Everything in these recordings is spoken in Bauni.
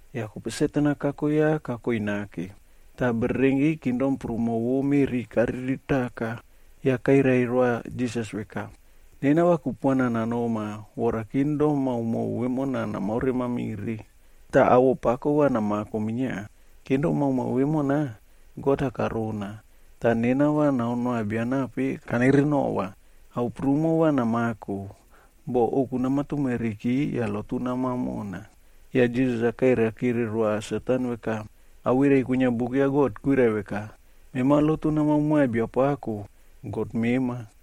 Yah kope Satan-a kako ya kakoi nake, tah bererenki kingdom prumo vo bo meꞌri kariritaka. Yah kairai roa Jisas veka, “Nena va kupuana nanoma vora kingdom maomao vemona namaore mamire, tah awoꞌo pako va namako minia. Kingdom maomao vemona God-a karona, tah nena va nanoa bia nape kanerenova. Ao prumo va namako, boh ouku nama tumeriki yah lotu namao mona.” Yah Jisas-a kairai kire roa Satanb veka, “Awirai kwinia Buk ya God kwirai veka, ‘Mema lotu namao moa Biapako, God mema,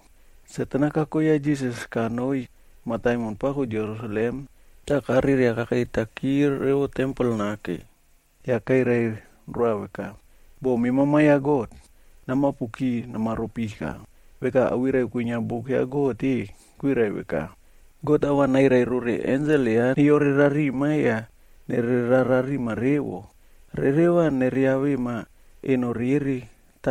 Satan kako ya Jisas kanoi mataimon pako Jerusalem tah kareria kakeitaki revo tempel nake, yah kairai roa veka, “Boh mema Ma ya God, namapuki namaro pika. Veka awirai kwinia Buk ya God-e, kwirai veka, ‘God va nairai rore ensel ya neyore rarima yah nererao rarima revo. Rere va neriavema eno rere,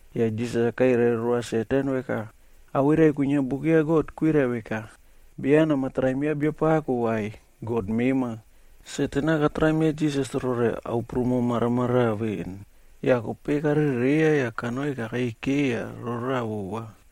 Yah Jisas-a kairai roa Satan veka, “Awirai kwinia Buk ya God kwirai veka, ‘Beya namatraim ya Biapako vai, Satan-a katraim ya Jisas rore ao prumo maramaraꞌa veꞌen, yah kope karereiya yah kanoi kakei keiya roraꞌa vova.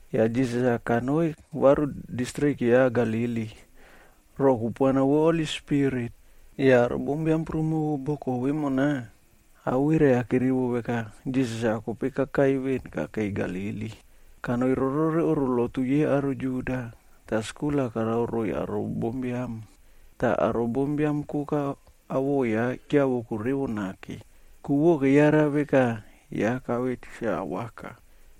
Yah Jisas kanoi varu distrik ya Galili, roꞌo kupuana vo Holi Spirit. Yah aro bombiam prumo vo boko vemona, awirai-a kerivo veka Jisas-a kope kakai kakei veni Galili. Kanoi rorore oꞌro lotu yei aro Juda,f tah skul-a karao roiy aro bombiam. Tah aro bombiam koka awoꞌo ya keavoko revo nake, ku vo keyara veka ya kave tikse awaka.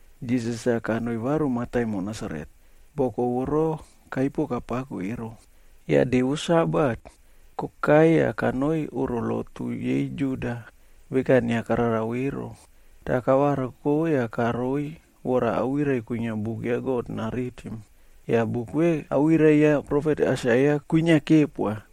Jisas-a kanoi varu mataimon Nasaret, boko voro kaipo kapako ero. Yah de vo Sabatg kokai yah kanoi oꞌro lotu yei Juda,h veka inia kararao ero. Tah kavariko yah karoi vora awirai kwinia buk ya God naritim. Yah buk ve awirai ya profet Aisaia kwinia kepoa.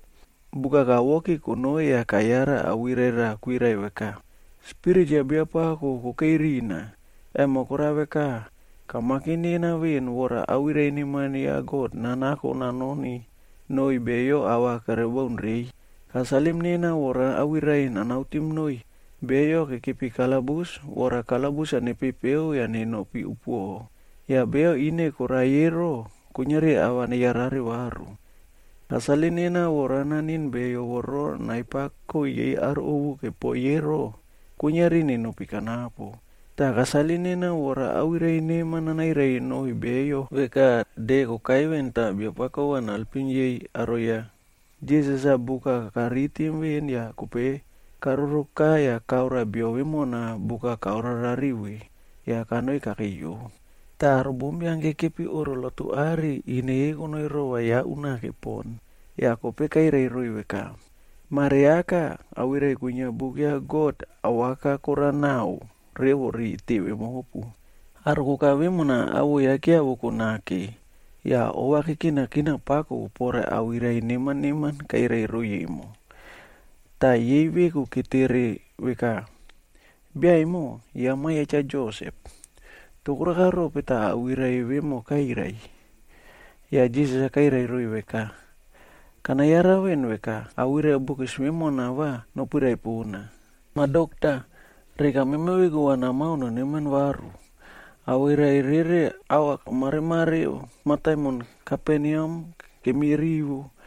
Buk-a kawoki konoi yah kayara awirai raꞌa kwirai veka, “Spirit ya Biapako kokei rina, emo korao veka, kamakim nena veꞌen vora awirai neman ya God-a nanako nanoni noiy beyo ava kere baun reiy. Kasalim nena vora awirai nanautim noiy beyo kekepi kalabus vora kalabus-a nepepeo yah nenopi upuoꞌo, yah beyo ine koraiy ero, kuiniari ava neyarare varu. Kasalim nena vora naniꞌin beyo voro nai pako yei aro ovu kepoiy ero, kuiniari nenopi kanapo. Tah kasalim nena vora awirai neman nanairai noiy beyo veka de kokai veꞌen tah Biapako va naelpim yei aro ya.”i Jisas-a buk-a karitim veꞌen yah kope karoroka yah karoa bia vemona buk-a kaore rariꞌi ve,j yah kanoi kakeiyo. Tah aro bombiam kekepi oꞌro lotu are, ine yei konoi rova ya unake pon. Yah kope kairai roiy veka, “Mare aka, awirai kwinia Buk ya God awaka korao naꞌao revo ri teve mopu.” Aro koka vemona awoꞌo ya keavoko nake yah ova kekinakina pako pore awirai neman neman kairai roiy emo. Tah yei veku ketere veka, “Bia emo, ya ma ya Cha Josep. Toh koraka rope tah awirai vemo kairai?” Yah Jisas-a kairai roiy veka, “Kana yara veꞌen veka, awirai bokis vemona va nopirai pona, ‘Mah Dokta, reka mema veku va namao noneman varu. Awirai rere ava kamareꞌmare mataimon Kaperneam kemi rivo,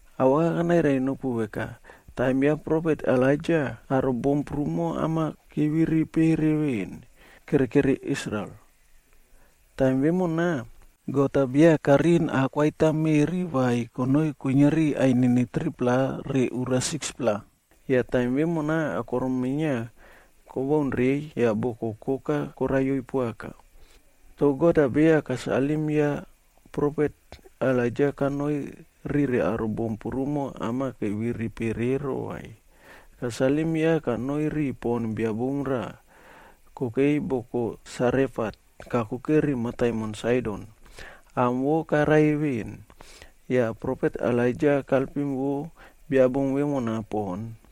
Awaka kanairai nopu veka, taim ya profet Elaija aro bom prumo am-a keviri pere veꞌen, kere keri Israel. Taim vemona, God-a beya kariꞌin aꞌ koaita meꞌri vai, konoi kuiniari ainini 3-pla re ura 6-pla. Yah taim vemona akorom-a minia kobaun reiy yah boko koka koraiyoi poaka. Toh God-a beya kasalim ya profet Elaija kanoi rire aro bom prumo am-a keviri pere ero vai. Kasalim ya kanoi ri pon bia bom raꞌal kokei boko Sarefat kakuke ri mataimon Saidon, am vo karai veni. Yah profet Elaija kaelpim vo bia bom vemona pon.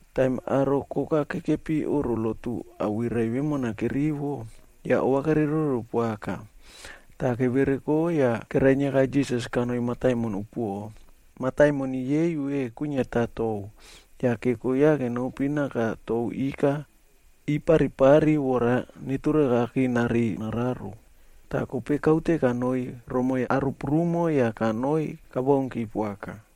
Taim aro koka kekepi oꞌro lotu awirai vemona kerivo, yah ova kereiroro poaka. Tah kevereko yah kerainiaka Jisas kanoi mataimon upuoꞌo. Mataimon yei ve kwiniata tou, yah keko ya kenopi naka tou ika iparipari vora neturakaki nareiy nararo. Toh kope kaute kanoi romoi aro prumo yah kanoi kabaunki poaka.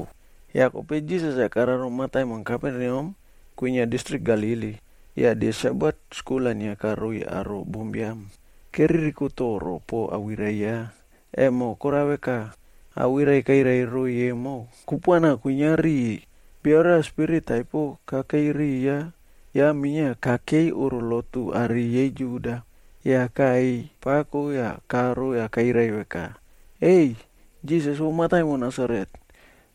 Yah kope Jisas-a kararo mataimon Kaperneam kwinia distrik Galili, yah de Sabat skul-a inia karoiy aro bombiam. Keririko toro poꞌo awirai ya, emo kora veka, awirai kairai roiy emo kupuana kwinia riu. Bio raꞌa spirit taipo kakei riya, ya minia kakei oꞌro lotu are yei Juda. Yah kaꞌeiy pako yah karo yah kairai veka, “Ei! Jisas vo mataimon Nasaret,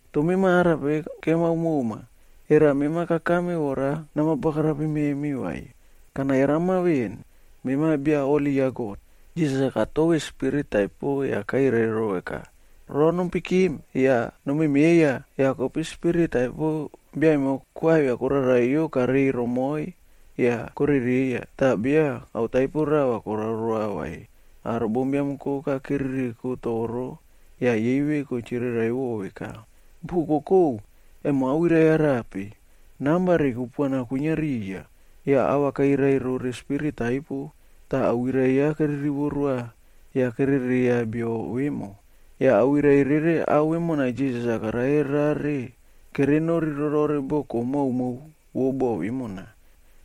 toh memi arape kemao moma? Era mema kakame vora nama bagarapim memi, vai? Kana yarama veꞌen, mema Bia Holi ya God.” Jisas-a katove spirit taipo yah kairai ro veka, “Ro nompikim! Yah nomemeiya!” Yah kope spirit taipo bia emo koavia koraraiyo kareiy romoiy yah korereiya, tah beya ao taipo rava karao roa vai. Aro bombiam koka keririko toro yah yei veku chiriraiꞌvo veka, “Bokokou, emo awirai arape? Namba re kupuana kwinia riya, yah ava kairai rore spirit taipo tah awirai ya kere rivo roa yah kere rereiya bio vemo.” Yah awirai rere ao vemona Jisas-a karare rare kere nori rorore boko maomao vo bo vemona.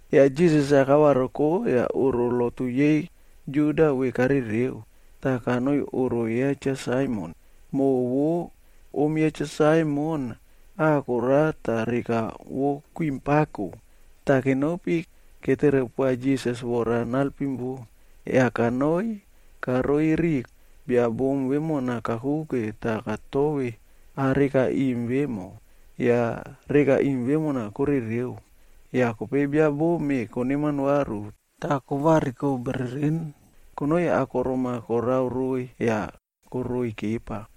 Yah Jisas-a kavariko yah oꞌro lotu yei Juda ve karereo, tah kanoi oꞌro ya Cha Saimon. Moꞌo vo om ya Cha Saimon ah korao tah reka vo kwiꞌim pako. Tah kenopi ketere poa Jisas vora naelpim vo. Yah kanoi karoi ri bia bom vemona kakuke tah katove ah reka iꞌim vemo, yah reka iꞌim vemona korereo. Yah kope bia bom-e koneman varu tah kovariko bereren konoi akorom-a korao roiy yah koroiy kepa.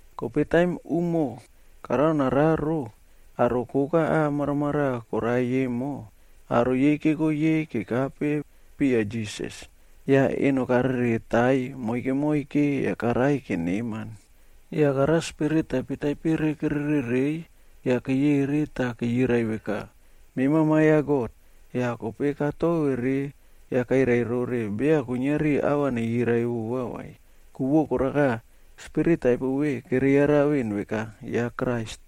Kope taim umo karao nararo, aro koka ah maramaraꞌa koraiy emo, aro yei keko yei kekape piya Jisas. Yah eno kareretaiy moike moike yah karaiy keneman. Yah karao spirit taipe taipere kere rereiy, yah keyeri tah keyirai veka, “Mema Ma ya God.” Yah kope katovere yah kairai rore beya kuiniari ava neyirai vova vai. Ku vo koraka, spirit taipo ve kere yara veꞌen veka ya Krais.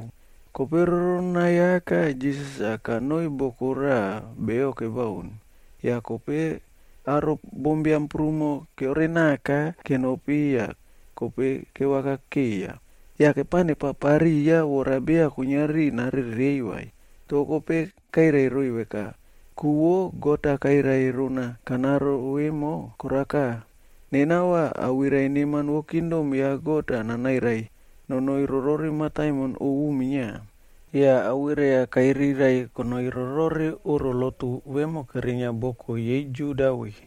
Kope roronai aka Jisas-a kanoi boko raꞌa beyo kebaun. Yah kope aro bombiam prumo keore naka kenopi yah kope kevaka keiya, yah kepao nepapariya vora beya kuiniari narereiy vai. Toh kope kairai roiy veka, “Ku vo God-a kairai rona kanaro vemo, koraka, nena va awirai neman vo kingdom ya God-a nanairai nonoi rore mataimon ovu minia.” Yah awirai-a kairirai kanoi rorore oꞌro lotu vemo kerinia boko yei Juda ve.